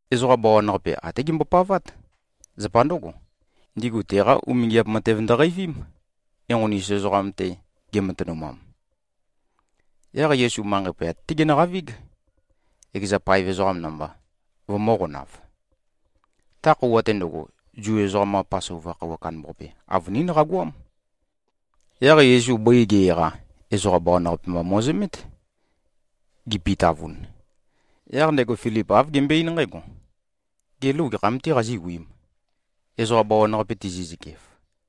Ezoqa bawan-qape até gembopavát. Zapa ndǿgo, ndigu teqa umingiap matev ndøqeivím, enqoni-us ezoqam-te gematønumam. Yaq Yesu manqei poyat-té genøqavíg, ekeza paev ezoqam namba, vømø̄qonav. Ta khøuwa-te ndøgo, Zu ezoqam-qa Pasova khøuwa kandambaqape, avønín qagoám. Yaq Yesu bøi ge-eqa, ezoqa bawan-qape mba mo꞉zømét, gipitavun. Yaq ndego Filip āv gembøe-eín nqǽgo, “Gê, lou gekham-tē qazíwiīm, ezoqa bawan-qape tizi꞉zøkef?”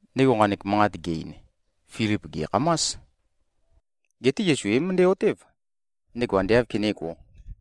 Ndego nqanek manqat ge-ein, Filip gè꞉khamás. Geté Yesu é-møndæ-otév, ndego ande āv kenégō.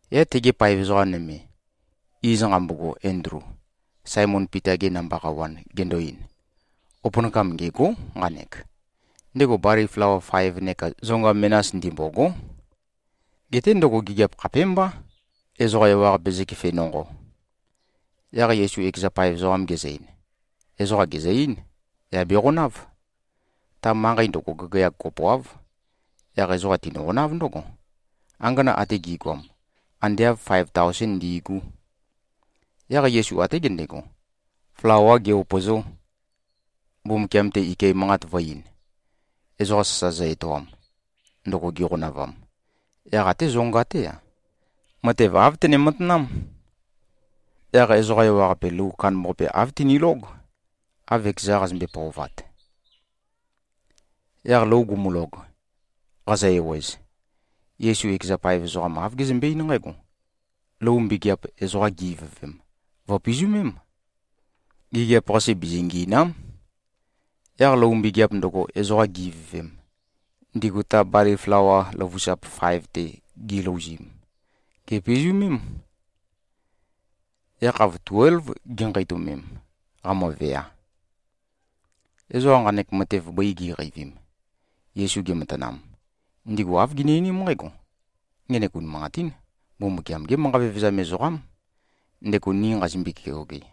Yaq tege paev ezoqa nøme, iz nqambogo Endlu, Saemon Pita-ge namba qawan, gendo-ein, “Opønakam ngêgó, nqanek. Ndego bali flawa faev neka zonga menas ndimbôgó. Geté ndøgo gigiap khapémbá, ezoqa ewaqape zøkefe nonqo.” Yaq Yesu ekeza paev ezoqam gezø-ein, “Ezoqa gèzø-eín, yà beqonáv.” Ta manqei ndøgo, gagayag kopoáv. Yaq ezoqa tinøqonáv ndǿgo. Angana ate gi꞉goam, ande āv faev taosén ndi꞉gú. Yaq Yesu até gendego, flawā ge-upø̀zō, Mbumbukiam-te ike manqat vø̄-ein, ezoqa sasa zø-etoam, ndøgo giqonavam. Yaq até zonga-té-a, matev āv tene-matanám. Yaq ezoqa ewaqape lou kandambaqape, āv tinilóg, av ekeza qazømbe-pøovat. Yaq lou gumulog, qazø-ewez, Yesu ekeza paev ezoqam, āv gezømbe-eín nqǽgo, “Lou mbegeap, ezoqa gi-ivøvem, vø̀pizømém. Gigiap-qase bizingiìna᷄m.” Yaq lou mbegeap ndøgo, ezoqa gi-ivøvem, ndigu ta bali flawa løvusap faev-te gilouzim, gèpizumém. Yakhav tuélv ginqeitømem, qamøvea. Ezoqa nqanek matev bøi gi꞉qeivim, Yesu gematanam, ndigu āv gini-einím nqǽgo, “Ngenek unimanqatín Mbumbukiam-gé manqa vevezam ezoqám, ndego ni nqazimbøe-keoge.”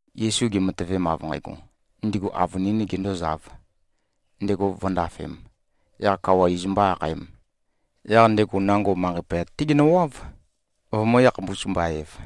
Yesu gematøvem, av nqægo, ndigu avønīn gendōzāv, ndego vǿndafēm, yaq kawa iz mbō-akhaēm, yaq ndego nango manqei poyat-té genøwáv, vømø̄-yakhapus-mba-ev.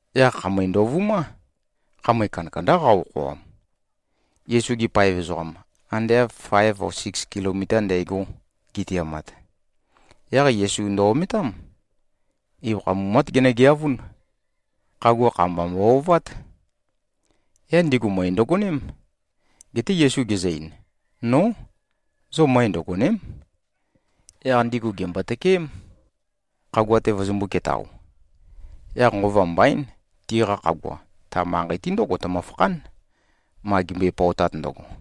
Yaq khamøe ndovumá. Khamøe kandakandá qa-okhoam. Yesu-gi paev ezoqam, ande av faev o siks kilomita ndægo gitiamat, yaq Yesu ndø-ometám. Ibøkha mumát genøgeavún. Khagua kha-mba mbo-ovát. Yaq ndigu møe ndøgoném. Geté Yesu gezø-ein, “Nó! Zo møe ndøgòne᷄m.” Yaq ndigu gèmbo-tøkeém, khagua-te vøzømbū-ketao. Yaq nqova mbaín, tiqa khagua, ta manqei-te ndǿgo tømøfakhán, ma gimbøe-pøotat ndøgo.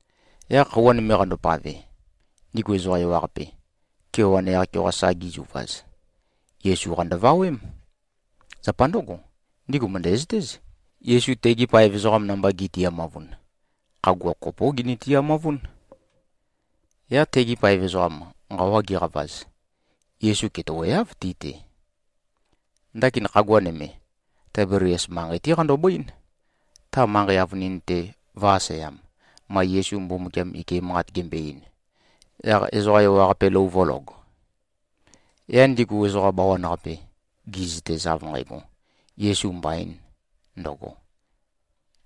Yaq khøuwa nøme qandopave, ndigu ezoqa ewaqape, kewan yaq-keoqa sa gizuvaz, Yesu-qa ndøvawém. Zapa ndǿgo, ndigu mø̀ndæzøtéz, Yesu tegi paev ezoqam namba gi꞉tiamavun, khagua kopó gini-tiamavún. Yaq tegi paev ezoqam, nqawa giqavaz, Yesu ketøweáv ti-te. Ndakin khagua nøme, Taibelias manqei-té qandobøín, ta manqei avønin-te vø̄-aseam, ma Yesu Mbumbukiam ike manqat gembo-ein, yaq ezoqa ewaqape lou vø̄log. Yaq ndigu ezoqa bawan-qape gi꞉zøtez av nqægo, Yesu mbaīn ndøgo,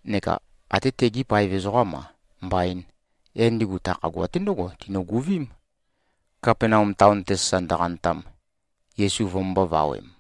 neka atē tegī paev ezoqām-a, mbaīn, yaq ndigu ta khagua-te ndǿgo tinøguvím, Kapenaum taon-te sasa ndøqantam, Yesu vømømbō-vawem.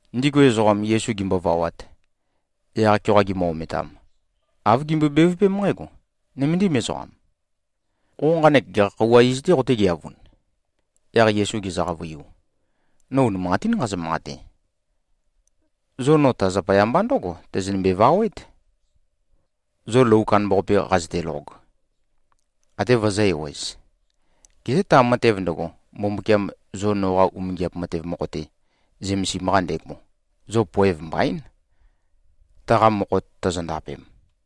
Ndigu ezoqam, Yesu gimbovawat, yaq-keoqa gimø-ometam, āv gimbøe-bevøpém nqǽgo, “Nøméndim ezoqam. Qo nqanek gekha khøuwa iz-tē qotégeavun?” Yaq Yesu gezø-qavøiu, “No unimanqatín nqazø-manqate. Zo no ta zapaya mba ndǿgo tøzønømbe-vawét, zo lou kandambaqape qazøtelog, até vøzø̄-ewez. Geté ta matev ndøgo, Mbumbukiam zo noqa umingiap matev mokho-te zømesim-qa ndego, zo poev mbaín, taqa mokho tozondapem.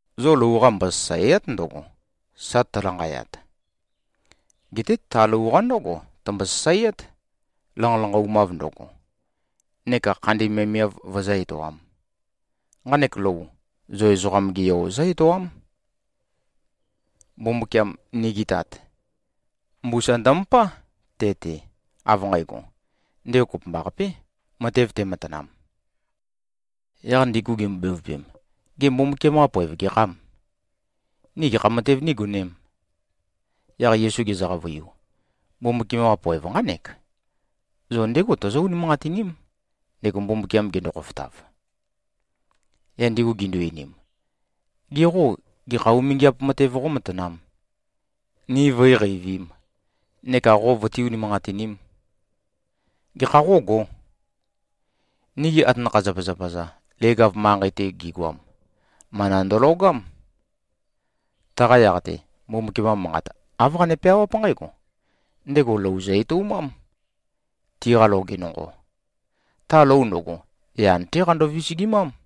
Zo lou-qa mbosasàea᷄t ndøgo, sa tølanqayat. Geté ta lou-qa ndǿgo tømbo-sasaeát, lanqalanqaumav ndøgo, neka khandi miavmiav vøzǿ-etoām. Nqanek lou, zo Ezoqam-ge Yo zǿ-etoám. Mbumbukiam, nigi Tat, mbusa ndømøpá te-te, av nqægo, ndego kopømbaqapé, matev tematanam.” Yaq ndigu gimbo-bevøpem, “Gê, Mbumbukiam-qa poev gekhâm? Ni gekha matev nígonēm?” Yaq Yesu gezø-qavøiu, “Mbumbukiam-qa poev nqánek: Zo ndégo tozó-unimanqatiním, ndego Mbumbukiam gendo-khofotav.” Yaq ndigu gindu-einim, “Ge qô, gekha umingiap matev qómatanām, ni vǿiqeivīm neka qo vøtí-unimanqatinīm? Gekha qógō? Nigi atanakha-zapazapa-za leg-av manqei-te gigoam, mana ndølogám. Taqa yaq-te, Mbumbukiam-qa manqat āv qane-peawáp nqǽgo, ‘Ndego lou zø-etoumám, tiqa loge nonqo. Ta lou ndøgo, yan-té qando-visigimám.’”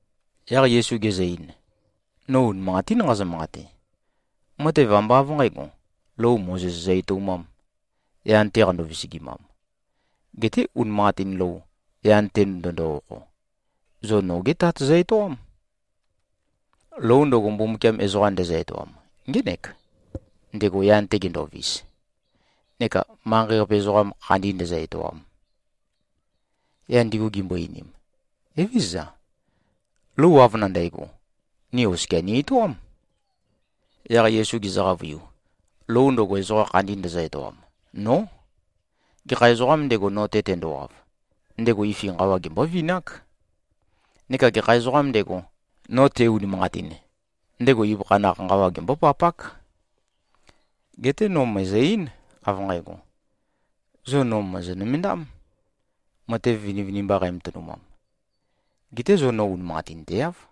Yaq Yesu gezø-ein, “No unimanqatín nqazø-manqate. Matev ambá av nqǣgo, lou Mozes zø-etoumām, yan-te qando-visigimam. Geté unimanqatin lou, yan-te ndøndo-okho, zo noge Tat zø-etoám. Lou ndøgo, Mbumbukiam ezoqa ndezø-etoam ngének, ndego yan-te gendovis neka manqei-qape ezoqam khandi ndēzø̄-ētōām.” Yaq ndigu gimbo-einim, “Evézøza. Lou av nandægo, ni oskia ni-etoám.” Yaq Yesu gezø-qavøiu, “Lou ndøgo, ezoqa khandi ndøzø-etoam, nó. Gekha ezoqām ndego, no-te tendowav, ndego ifi nqawa gembóvinák. Neka gekha ezoqām ndego, no te-unimanqatin, ndego ibøkha naq nqawa gembópapák. Geté no mø̀ezø-eín, av nqægo. Zo no mòzo-nømendám, matev vinivinimba qæmatønumam. Geté zo no unimanqatinteáv.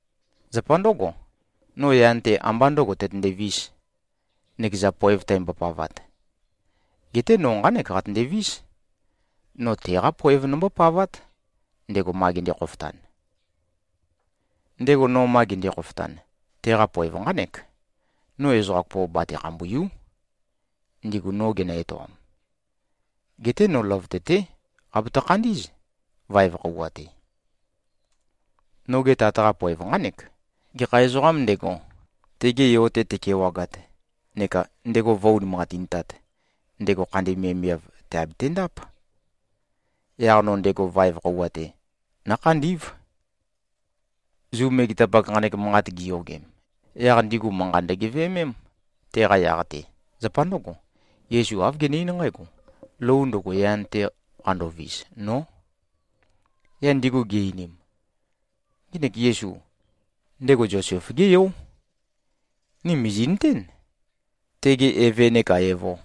Zapa ndǿgo, no yan-te ambá ndø̄go tøtøndēvis, nøkeza poev tæmbopavat. Geté no nqánek qatøndevís, no teqá poev nombópavát, ndego ma gende-khofotan. Ndego no ma gende-khofotan, teqa poev nqánek: No ezoqa kopo bate-khambùiu᷄, ndigu no genø-etoam. Geté no løvøte-té qabatø-khandí꞉z, vaev khøuwa-te. Noge Tat-qa poev nqánek: Gekha ezoqām ndego, tege Yo-te tekewagat neka ndego vǿ-unimanqatintāt, ndego khandi miavmiav tèabetendáp. Yaq no ndego vaev khøuwa-te nǿkhandí꞉v.” Zu megetapak nqanek manqat giyogem, yaq ndigu manqa ndøgeveømém, teqa yaq-te. Zapa ndǿgo, Yesu āv gene-eín nqǽgo, “Lou ndøgo, yan-te qandovis, nó.” Yaq ndigu gi-einim, “Ngenek Yesu, ndego Zosef-gé yó. Ni mìzi꞉nøtén, tege eve neka evo.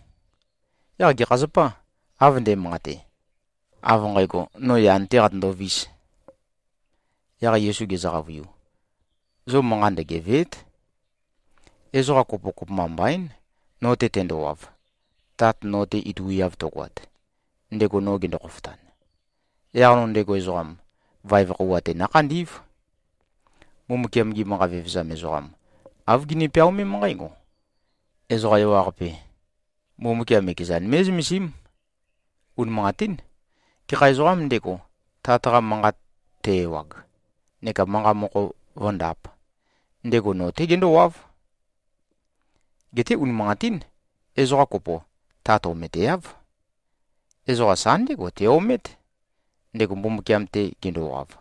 Yaq gekha zapâ, av nde꞉manqate, av nqægo, no yan-tē qatøndovīs?” Yaq Yesu gezø-qavøiu, “Zo manqa ndøgevèe᷄t. Ezoqa kopo kopømba mbaín, no-te tendowav, Tat no-te ituiav tøgoat, ndego no gendo-khofotan. Yaq no ndego ezoqam, vaev khøuwa-te nǿkhandí꞉v. Mbumbukiam-gi manqa vevezam ezoqam, āv gini-peaomém nqǽgo, ‘Ezoqa ewaqape, Mbumbukiam ekezan mé꞉zømesím.’ Unimanqatín. Gekha ezoqām ndego, Tat-qa manqat te-ewag neka manqa mokho vǿndāp, ndego no-té gendówáv. Geté unimanqatín. Ezoqa kopo, Tat ometeáv. Ezoqa sa ndégo te-omét, ndego Mbumbukiam-te gendowav.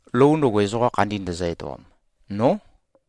Lou ndøgo, ezoqa khandi ndøzø-etoam, nó.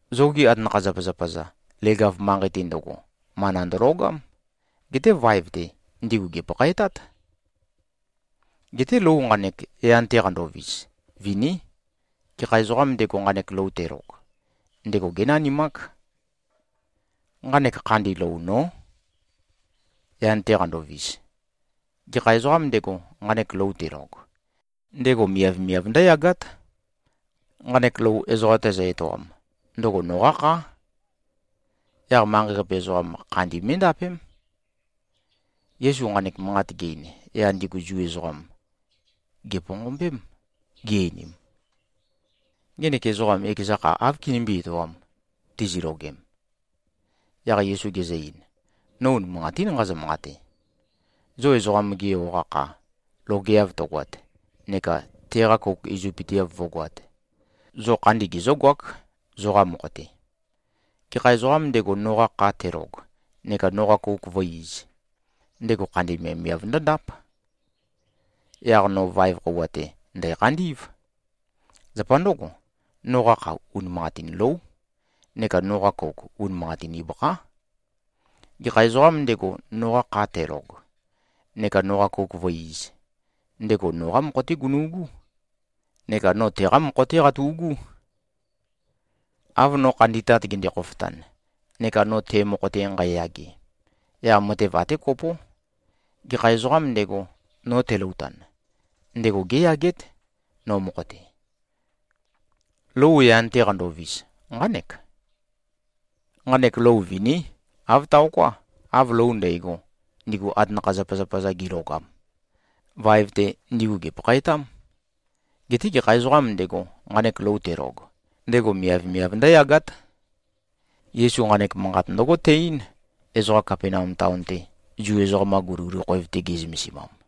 Zogi atanakha-zapazapa-za, leg-av manqei-te ndøgo, mana ndølogám. Geté vaev-te, ndigu gèpakhaetát. Geté lou nqanek, yan-te qandovis, viní. Gekha ezoqām ndego, nqanek lou telog, ndego génanimák. Nqanek khandi lou nó, yan-te qandovis. Gekha ezoqām ndego, nqanek lou telog, ndego miavmiav ndǿyagát. Nqanek lou, ezoqa tæzø-etoam, ndøgo noqá khá. Yaq manqei-qape ezoqam, khandi mé꞉ndapém.” Yesu nqanek manqat ge-ein, yaq ndigu Zu ezoqam, gèponqombém, gi-einim, “Ngenek ezoqam ekeza kha áv kinimbí-etoām, tizilogem?” Yaq Yesu gezø-ein, “No unimanqatín nqazø-manqate. Zo Ezoqam-ge Yo-qa kha logeav tøgoat neka teqa kouk izøpøteav vǿgoāt, zo khandi gezǿgoák, zoqa mokho-te. Gekha ezoqām ndego, noqa kha telog neka noqa kouk vǿ-īz, ndego khandi miavmiav ndǿndáp. Yaq no vaev khøuwa-te ndæ̀khandí꞉v. Zapa ndǿgo, noqa kha unimanqatin lóu, neka noqa kouk unimanqatin ibøkhá. Gekha ezoqām ndego, noqa kha telog neka noqa kouk vǿ-īz, ndego noqá mokho-té gunu꞉gú neka no teqá mokho-té qatu꞉gú. Av no khandi Tat gende-khofotan, neka no te mokho-te nqæyage, yaq matev até kopó. Gekha ezoqām ndego, no teloutan, ndego géyagét, no mokho-te. Lou yan-te qandovis, nqánek. Nqanek lou viní. Āv taoká, av lou ndægo, ndigu atanakha-zapazapa-za gilogam. Vaev-te, ndigu gèpakhaetám. Geté gekha ezoqām ndego, nqanek lou telog, ndego miavmiav ndǿyagát.” Yesu nqanek manqat ndǿgo te-eín, ezoqa Kapenaum taon-te, Zu ezoqam-qa guliguli khoev-te ge꞉zømesimam.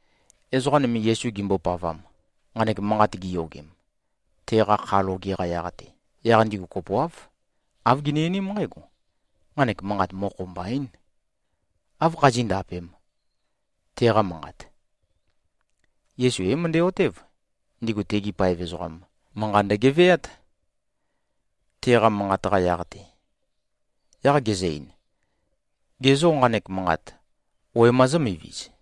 Ezoqa nøme, Yesu gimbopavam, nqanek manqat giyogem, teqa kha loge-qa yaq-te, yaq ndigu kopoáv, āv gini-einím nqǽgo, “Nqanek manqat mokho mbaín. Áv khazí꞉-ndapēm, teqa manqat?” Yesu é-møndæ-otév, ndigu tegi paev ezoqam, manqa ndøgeveát, teqa manqat-qa yaq-te. Yaq gezø-ein, “Ge zô, nqanek manqat wema zǿmiviz?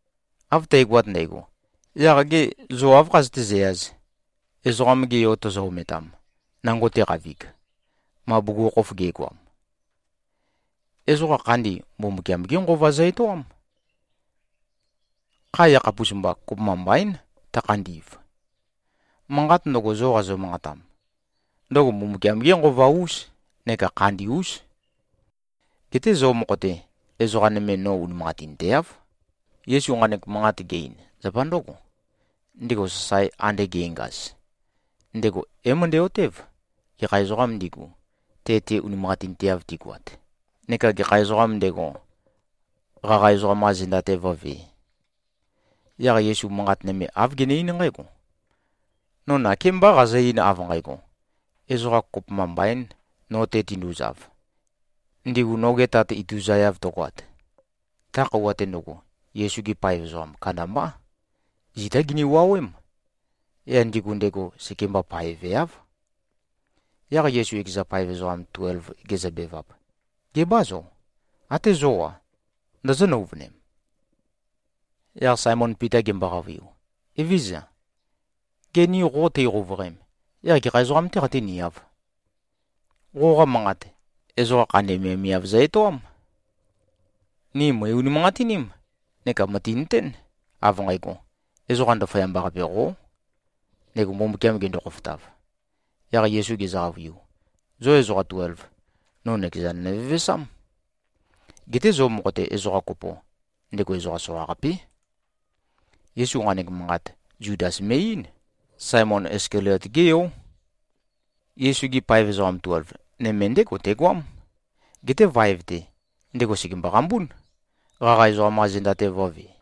Av tægoat ndægo. Yaq gê, zo áv khazøté-zæyāz, Ezoqam-ge Yo tozo-ometam, nango teqavig, ma bugukhokhof ge꞉goam? Ezoqa khandi, Mbumbukiam-gé Nqova zø-etoám. Kha yakhapus-mba, kopømba mbaín tøkhandi꞉v. Manqat ndøgo, zo qazø-manqatam, ndøgo Mbumbukiam-gé Nqova-ús neka khandi-ús. Geté zo mokho-te, ezoqa nøme no unimanqatinteáv.” Yesu nqanek manqat ge-ein, zapa ndǿgo. Ndego sasae ande ge꞉ngaz, ndego é-møndæ-otév, gekha ezoqām ndigu, te-te unimanqatinteav tigoat neka gekha ezoqām ndego, qaqa ezoqam-qa zenda-te vǿvē. Yaq Yesu manqat nøme āv gene-eín nqǽgo, “No nakémbá qazø-ein, av nqægo, ezoqa kopømba mbaīn no-te tinduzav, ndigu noge Tat ituzaeav tøgoat.” Ta khøuwa-te ndøgo, Yesu-gi paev ezoqa kandambá, zitá gini-wuowém. Yaq ndigu ndego sekemba paeveáv. Yaq Yesu ekeza paev ezoqa tuelv gezøbevap, “Gebâ zo? Até zó-a, ndozó-nøuvønem?” Yaq Saemon Pita gembo-qavøiu, “Evézøza. Gê, ni qo teiqouvøqem, yaq gekha ezoqam-tē qeitǿniāv? Qoqa manqat, ezoqa khandi miavmiav zø-etoám. Ni mø̀i-unimanqatiním neka mø̀tinøtén, av nqægo, Ezoqa Ndaføyamba-qape qó, ndego Mbumbukiam gendo-khofotav.” Yaq Yesu gezø-qavøiu, “Zo ezoqa tuelv, no nøkezan nøvevesám. Geté zo mokho-te, ezoqa kopo, ndego ezoqa soqaqapé.” Yesu nqanek manqat, Zudas me꞉-eín. Saemon Iskaliot-gé yó. Yesu-gi paev ezoqa tuelv, nøme ndégo tegoám. Geté vaev-te, ndego sègembo-qambún, qaqa ezoqam-qa zenda-te vø̄ve.